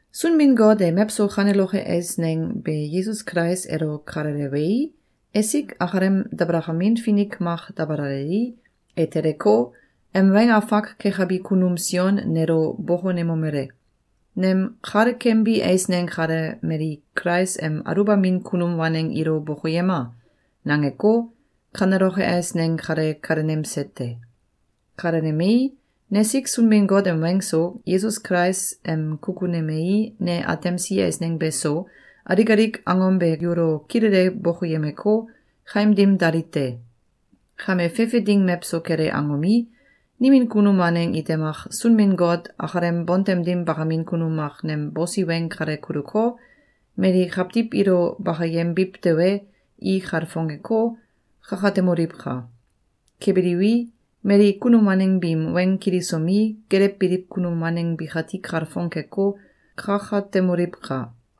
Sunbin-Got e mewso kaneloke eisneng be Yesus Kulais elo kalelewei, esik akalem dabalakamin finik mak dabalalei, e teleko, em weng afak kekabi kunum Sion nelo bokonemomele: “Nem kalekembi eisneng kale mali Kulais em aluwbamin kunum waneng ilo bokoyema!”, nangeko, kaneloke eisneng kale kalenemse te. Kalenemei, nesik Sunbin-Got em weng so, Yesus Kulais em kukunemei, ne atemsi eisneng beso, alik alik angom be yulo kilele bokoyemeko, kaim dim dali te. Kame fefe ding mewso kele angomi, nimin kunum waneng ite mak Sunbin-Got akalem bontem dim bakamin kunum mak nem bosi weng kale kuluko, mali kawtiw ilo bakayembiw tewe, i kalfongeko, kakatemoliwka! Kebiliwi, mali kunum waneng biim weng kilisomi, gelewbiliw kunum waneng bikati kalfong keko, kakatemoliwka!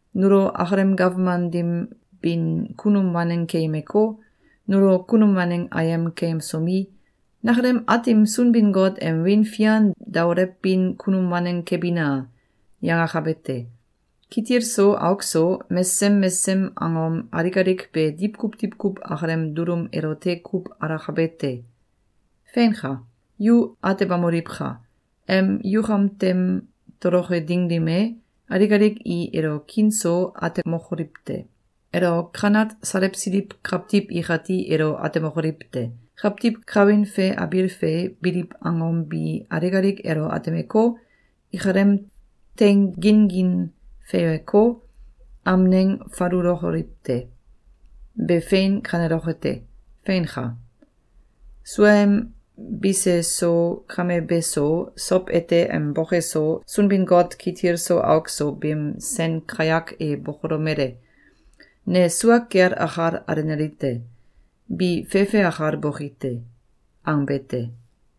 nulo akalem gawman dim bin kunum waneng keyemeko, nulo kunum waneng ayem keyemsomi, “Nakalem Aatim Sunbin-Got em wiin fian daolewbin kunum waneng kebina!”, yangakabe te. Kitil so auk so, mesesem mesesem angom alik alik be diwkuw diwkuw akalem dulum elote kuw alakabe te! Feinka! Yu atebamoliwka! Em yukam tem toloke ding dim e, alik alik i elo kiin so atemokoliw te. Elo kanat salewsiliw kawtiw ikati elo atemokoliw te. Kawtiw kawin fe abiil fe biliw angom bi alik alik elo atemeko, ikalem teing gin-gin feiweko, amneng falulokoliw te. Be fein kaneloke te. Feinka. Suaem bise so, kame be so, sow ete em boke so Sunbin-Got kitil so auk so beem sen kayak e bokolomele: “Ne sua kel akal alenali te. Bi fefe akal boki te.”, angbe te.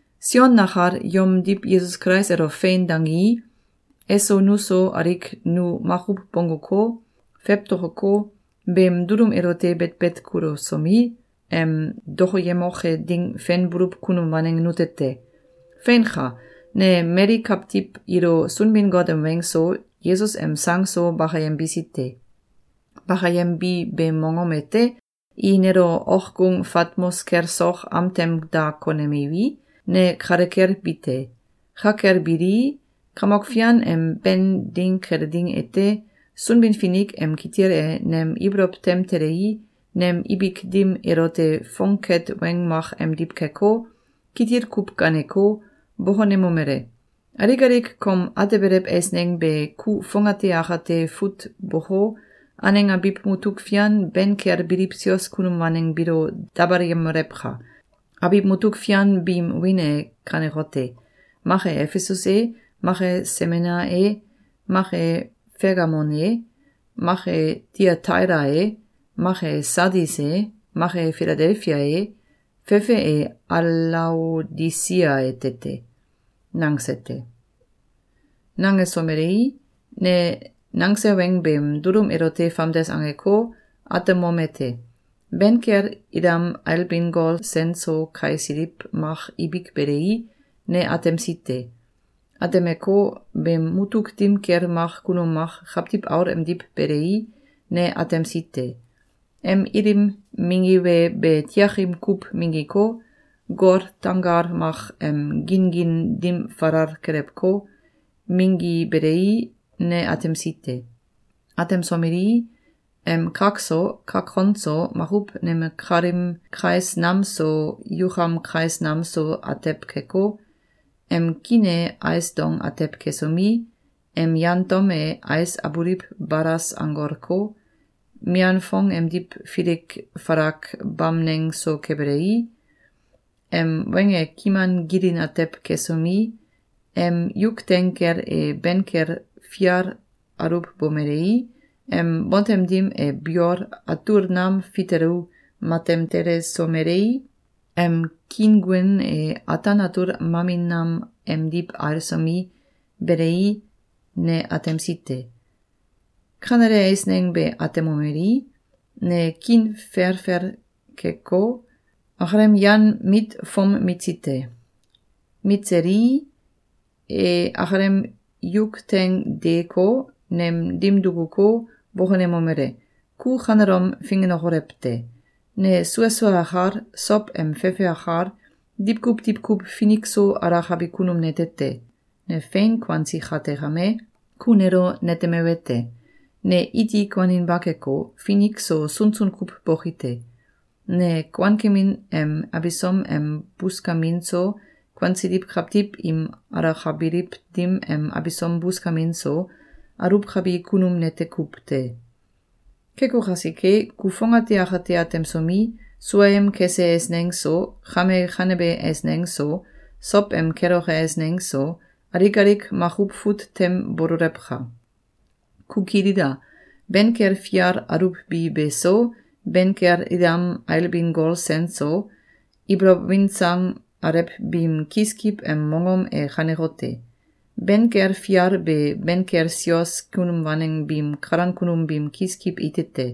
Sion nakal yomdiw Yesus Kulais elo “Fein!”, dangii, eso nuso alik nu makuw bongguko, fewtokoko, beem dulum elote betbet kulusomi, em dokoyemoke ding fenbuluw kunum waneng nute te. Feinka! Ne mali kawtiw ilo Sunbin-Got em weng so, Yesus em sang so bakayembisi te. Bakayembi beem mongom ete, i nelo okgung Fatmos kel sok am tem da konemiwi, ne kale kel bi te. Ka kel bilii, Kamok Fian em Ben ding kele ding ete, Sunbin-Finik em kitil e nem ibolow tem telei, nem ibik dim elote fongket weng mak emdiw keko, kitil kuw gaaneko, bokonemomele: “Alik alik kom atebelew eisneng be ku fongate akate fut boko, aneng abiw mutuk fian ben kel biliw sios kunum waneng biilo dabalayemolewka! Abiw mutuk fian biim wiin e kanekote: Mak e Efesus e, mak e Semena e, mak e Fegamum e, mak e Tayataila e, mak e Sadis e, mak e Filadelfia e, fefe e Alaodisia ete te.”, nangse te. Nangesomelei, ne nangse weng beem dulum elote famdes angeko, atemom ete: Ben kel ilam ailbin gol sen so kaisiliw mak ibik belei, ne atemsi te. Atemeko, beem mutuk dim kel mak kunum mak Kawtiw Aul emdiw belei, ne atemsi te. Em ilim minggibe be tiakim kuw minggiko, gol tanggal mak em gin-gin dim falal kelewko, minggibelei, ne atemsi te. Atemsomelii, em kak so, kak kon so, makuw neme kalim kais nam so yukam kais nam so atew keko, em kiin e ais dong atew kesomi, em yan tom e ais abuliw balas anggolko, mian fong emdiw filik falak bamneng so kebelei, em weng e kiman gilin atew kesomi, em yuk teing kel e ben kel fial aluwbomelei, em bontem dim e biol atul nam fitelu matem telesomelei, em kiinguen e ataan atul mamin nam emdiw ailsomi, belei, ne atemsi te. Kanele eisneng be atemomelii, ne kiin felfel keko, akalem yan mit fom mitsi te. Mitselii, e akalem yuk teing deeko, nem dim dukuko, bokonemomele: “Ku kanelom fingenokolew te! Ne sua sua akal, sow em fefe akal, diwkuw diwkuw finik so alakabi kunum nete te. Ne fein kuansi kate kame, ku nelo netemewete: Ne iti kuaninba keko, finik so sunsun kuw boki te. Ne kuankemin em abisom em buskamin so, kuansiliw kawtiw im alakabiliw dim em abisom buskamin so, aluwkabi kunum nete kuw te. Keko kasike, ku fongate akate atemsomi, suaem kese eisneng so, kame kanebe eisneng so, sow em keloke eisneng so, alik alik makuw fut tem bololewka! Ku kilila! Ben kel fial aluwbi be so, ben kel ilam ailbin gol sen so, ibolow win sang alew biim kiskiw em mongom e kanekote: Ben kel fial be ben kel sios kunum waneng biim kalan kunum biim kiskiw ite te.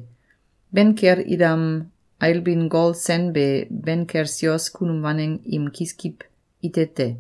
Ben kel ilam ailbin gol sen be ben kel sios kunum waneng im kiskiw ite te.